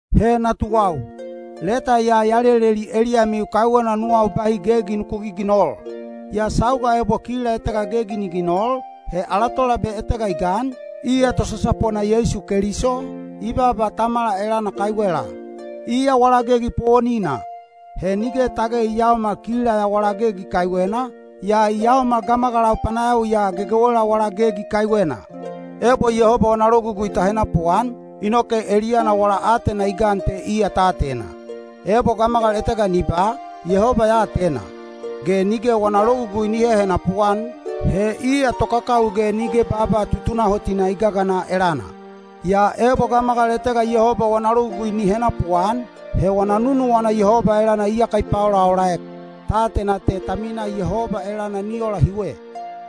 He natuwau, leta ya ya leleli eliyamiu kaiwena nuwau bahi gegi nuku giginol. Yaa sauga ebo kila etega gegi ni ginol, he ala Tolabe etega i gan, iya tosasapona Yeisu Keliso, i baaba Tamala elana kaiwela. Iya wala gegi powonina. He nige tage i yaomal kila ya wala gegi kaiwena, yaa i yaomal gamagalau panayawiya gegewela wala gegi kaiwena. Ebo Yehoba wana logugui ta henapuan, inoke eliyana wala aatena i gan te iya ta atena. Ebo gamagal etega ni ba, “Yehoba ya atena” ge nige wana logugui ni hehenapu-an, he iya tokakawi ge nige baaba tutunahotina i gagana elana. Yaa ebo gamagal etega Yehoba wana logugui ni henapuan, he wana nunuwana Yehoba elana iyaka i paolaolaek. Ta atena te ta minaa Yehoba elana ni ola hiwe: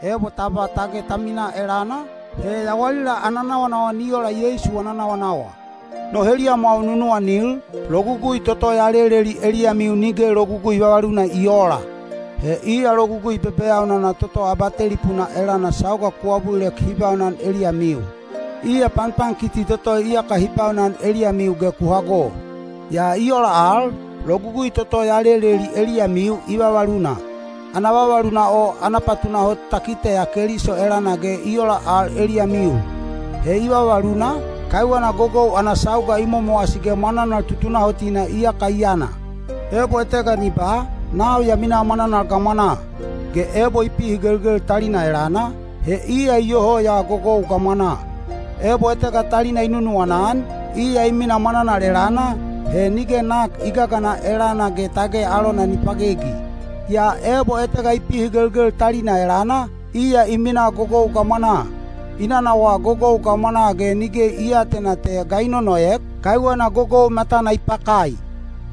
ebo ta ba tage ta minaa elana, he yawalila ana nawanawa ni ola Yeisu wana nawanawa. No heliyamwau nunuwanil, logugui toto ya leleli eliyamiu nige logugui vavaluna i oola. He iya logugui bebeyaunana toto abatelipuna elana sauga ku abulilek hi baunan eliyamiu. Iya panpankiti toto iyaka hi baunan eliyamiu ge ku hago. Yaa i ola al, logugui toto ya leleli eliyamiu i vavaluna. Ana vavaluna o ana patunahot ta kiteya Keliso elana ge i ola al eliyamiu. He i vavaluna, kaiwena gogou ana sauga i momowasi ge mwananal tutunahotina iyaka i yana. Ebo etega ni ba, “Nau ya minaa mwananal gamwanaa” ge ebo i pihigelgel talina elana, he iya iyoho ya gogou gamwanaa. Ebo etega talina i nunuwana-an, iya i minaa mwananal elana, he nige nak i gagana elana ge tage alona ni pagegi. Yaa ebo etega i pihigelgel talina elana, iya i minaa gogou gamwanaa. I nanawaa gogou gamwanaa ge nige i aatena te ga i nonoek, kaiwena gogou matana i pakai.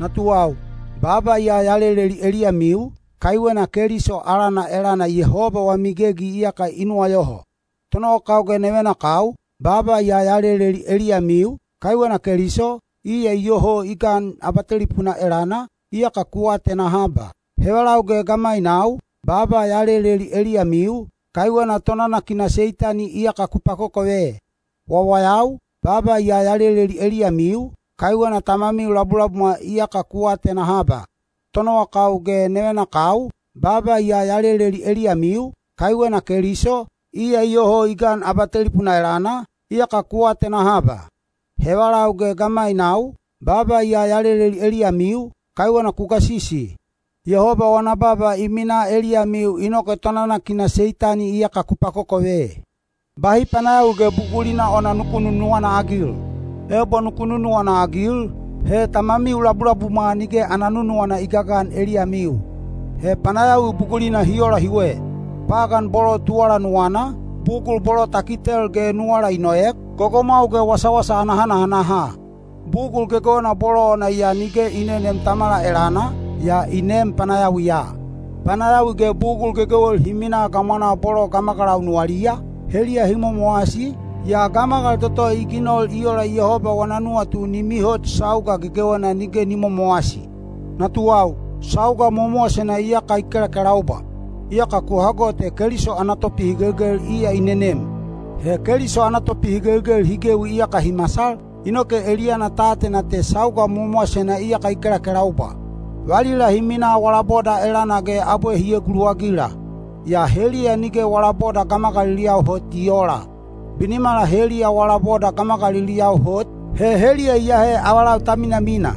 Natuwau, baaba ya ya leleli eliyamiu, kaiwena Keliso alana elana Yehoba wami gegi iyaka i nuwayoho. Tonowakau ge nevenakau, baaba ya ya leleli eliyamiu, kaiwena Keliso, iya iyoho i gan abatelipuna elana, iyaka ku atena haba. Hevalau ge gamainau, baaba ya ya leleli eliyamiu, kaiwena tonanakina Seitani iyaka ku pakokove. Natuwau, baaba ya ya leleli eliyamiu, kaiwena Tamamiu labulabumwa iyaka ku atena haba. Tonowakau ge nevenakau, baaba ya ya leleli eliyamiu, kaiwena Keliso, iya iyoho i gan abatelipuna elana, iyaka ku atena haba. Hevalau ge gamainau, baaba ya ya leleli eliyamiu, kaiwena ku gasisi. Yehoba wana baaba i minaa eliyamiu inoke tonanakina Seitani iyaka ku pakokove. Bahi panayawi ge bugulina ona nuku nunuwana-agil. Ebo nuku nunuwana-agil, he Tamamiu labulabumwa nige ana nunuwana i gagan eliyamiu. He panayawi bugulina hi ola hiwe: pagan bolo tuwala nuwana, bugul bolo ta kitel ge nuwala i noek, gogomwau ge wasawasa ana hanahanaha. Bugul gegewena bolo ona ya nige i neneem Tamala elana, yaa i neem panayawiya. Panayawi ge bugul gegewel hi minaa gamwanaa bolo gamagalau nuwaliya, heliya hi momowasi, yaa gamagal toto i ginol i ola Yehoba wana nuwatu ni mihot sauga gegewena nige ni momowasi. Natuwau, sauga mowamowasena iyaka i kelakelaubwa. Iyaka ku hago te Keliso ana Topihigelgel iya i nenem. He Keliso ana topihigelgel hi gewi iyaka hi masal, inoke eliyana ta atena te sauga mowamowasena iyaka i kelakelaubwa. Valila hi minaa wala boda elana ge abwe hi eguluwagila. Yaa heliya nige wala boda gamagaliliyau hot i oola. Binimala heliya wala boda gamagaliliyau hot, he heliya iyahe avalau ta minamina.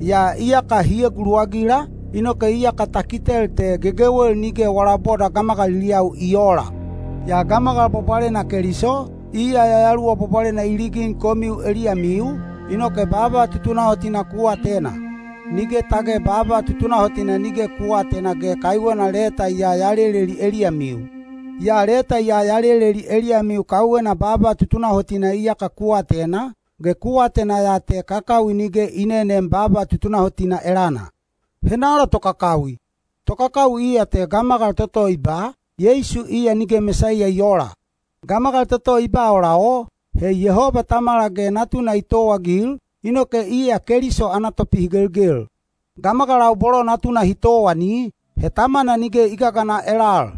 Yaa iyaka hi eguluwagila, inoke iyaka ta kitel te gegewel nige wala boda gamagaliliyau i oola. Yaa gamagal bwabwalena Keliso, iya Yayaluwa Bwabwalena i ligin komiu eliyamiu, inoke baaba tutunahotina ku atena. Nige tage baaba tutunahotina nige ku aatena ge kaiwena leta ya ya leleli eliyamiu. Yaa leta ya ya leleli eliyamiu kaiwena baaba tutunahotina iyaka ku atena, ge ku atena ya te kakawi nige i neneem baaba tutunahotina elana. Henala tokakawi? Tokakawi iya te gamagal toto i ba, “Yeisu iya nige Mesaiya i oola.” Gamagal toto i ba ola o, he Yehoba Tamala ge Natuna i towaagil, inoke iya Keliso ana topihigelgel. Gamagalau bolo Natuna hi towani, he Tamana nige i gagana elal.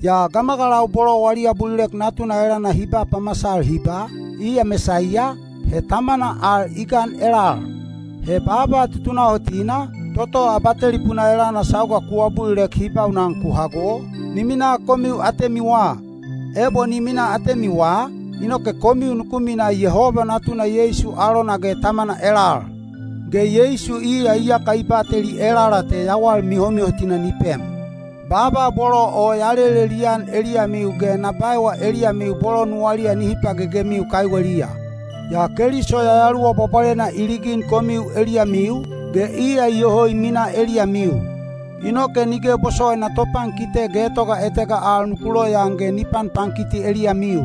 Yaa gamagalau bolo wali abulilek Natuna elana hi ba pamasal hi ba, “Iya Mesaiya,” he Tamana al i gan elal. He baaba tutunahotina, toto abatelipuna elana sauga ku abulilek hi baunan ku hago, ni minaa komiu atemiwa. Ebo ni minaa atemiwa, inoke komiu nuku mina Yehoba Natuna Yeisu alona ge Tamana elal. Ge Yeisu iya iyaka i bateli elala te yawal mihomihotina ni pem. Baaba bolo o ya lelelian eliyamiu ge na baewa eliyamiu bolo nuwaliya nihi pagegemiu kaiweliya. Yaa Keliso Yayaluwa Bwabwalena i ligin komiu eliyamiu, ge iya iyoho i minaa eliyamiu. Inoke nige bosowaina topankite getoga etega al nuku loyaan ge ni panpankiti eliyamiu.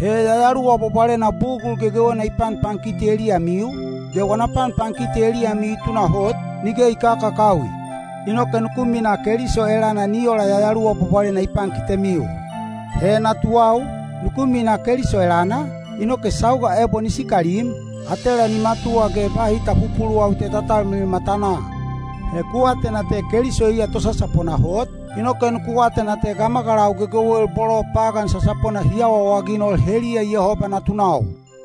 He Yayaluwa Bwabwalena bugul gegewena i panpankiti eliyamiu, ge wana panpankiti eliyamiu i tunahot, nige i kakakawi. Inoke nuku minaa Keliso elana ni ola Yayaluwa Bwabwalena i pankitemiu. He natuwau, nuku minaa Keliso elana, inoke sauga ebo ni sikalim, atela ni matuwa ge bahi ta pupuluwawi te ta talmilil matanaa. He ku atena te Keliso iya tosasapona hot, inoke nuku atena te gamagalau gegewel bolo pagan sasapona hi awaawaginol heliya Yehoba natunau.